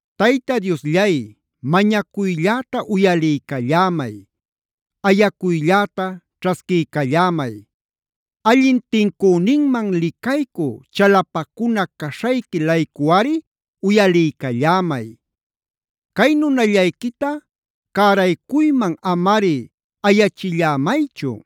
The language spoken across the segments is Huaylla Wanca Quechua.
Tayta Diosllay, mañacuylläta uyaliycallämay. Ayacuylläta ćhasquiycallämay. Allin tincüninman licaycü, chalapacuna caśhayqui-laycuꞌari uyaliycallämay. Cay nunallayquita cäraycuyman amari ayachillämaychu.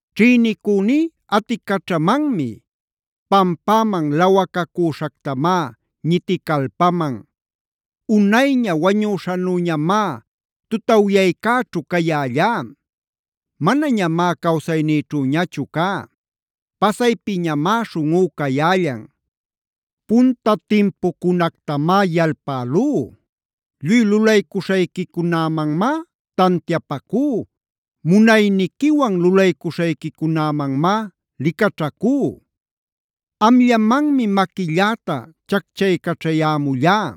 Ćhïnicüní aticaćhamanmi. Pampäman lawacacüśhactamá ñiticalpaman. Unayña wañüśhanüñamá tutawyaycäćhu cayällá. Manañamá cawsaynïćhüñachu cá. Pasaypiñamá śhunꞌú cayällan. Punta timpucunactamá yalpälú. Lluy lulaycuśhayquicunämanmá tantiapacú, munayniquiwan lulaycuśhayquicunämanmá licaćhacú. Amllamanmi maquilläta chacchaycaćhayämullá.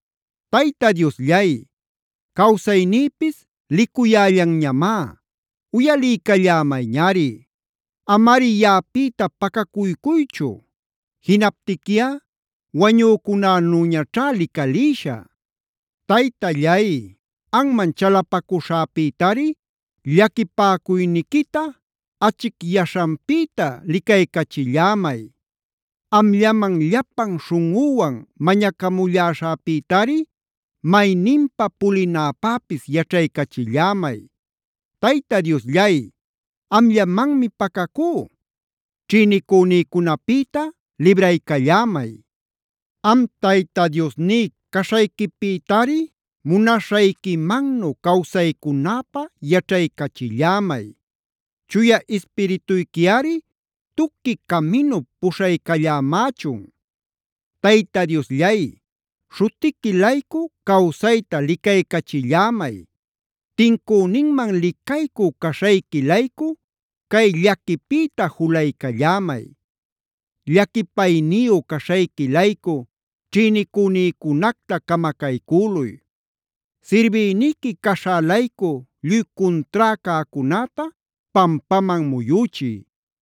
Tayta Diosllay, cawsaynïpis licuyällanñamá; uyaliycallämayñari. Amari yaꞌapïta pacacuycuychu. Jinaptiquiꞌa wañücunänüñaćhá licalïshä. Taytallay, anman chalapacuśhäpïtari llaquipäcuyniquita achicyaśhanpïta licaycachillämay. Amllaman llapan śhunꞌüwan mañacamulläśhäpïtari mayninpa pulinäpäpis yaćhaycachillämay. Tayta Diosllay, amllamanmi pacacú. Ćhïnicünïcunapïta libraycallämay. Am Tayta Diosní caśhayquipïtari munaśhayquimannu cawsaycunäpä yaćhaycachillämay. Chuya Ispirituyquiꞌari tuqui caminup puśhaycallämächun. Tayta Diosllay, śhutiqui-laycu cawsayta licaycachillämay. Tincüninman licaycü caśhayqui-laycu cay llaquipïta julaycallämay. Llaquipayniyu caśhayqui-laycu ćhïnicünïcunacta camacaycüluy. Sirbïniqui caśhä-laycu lluy cuntrá cäcunäta pampaman muyüchiy.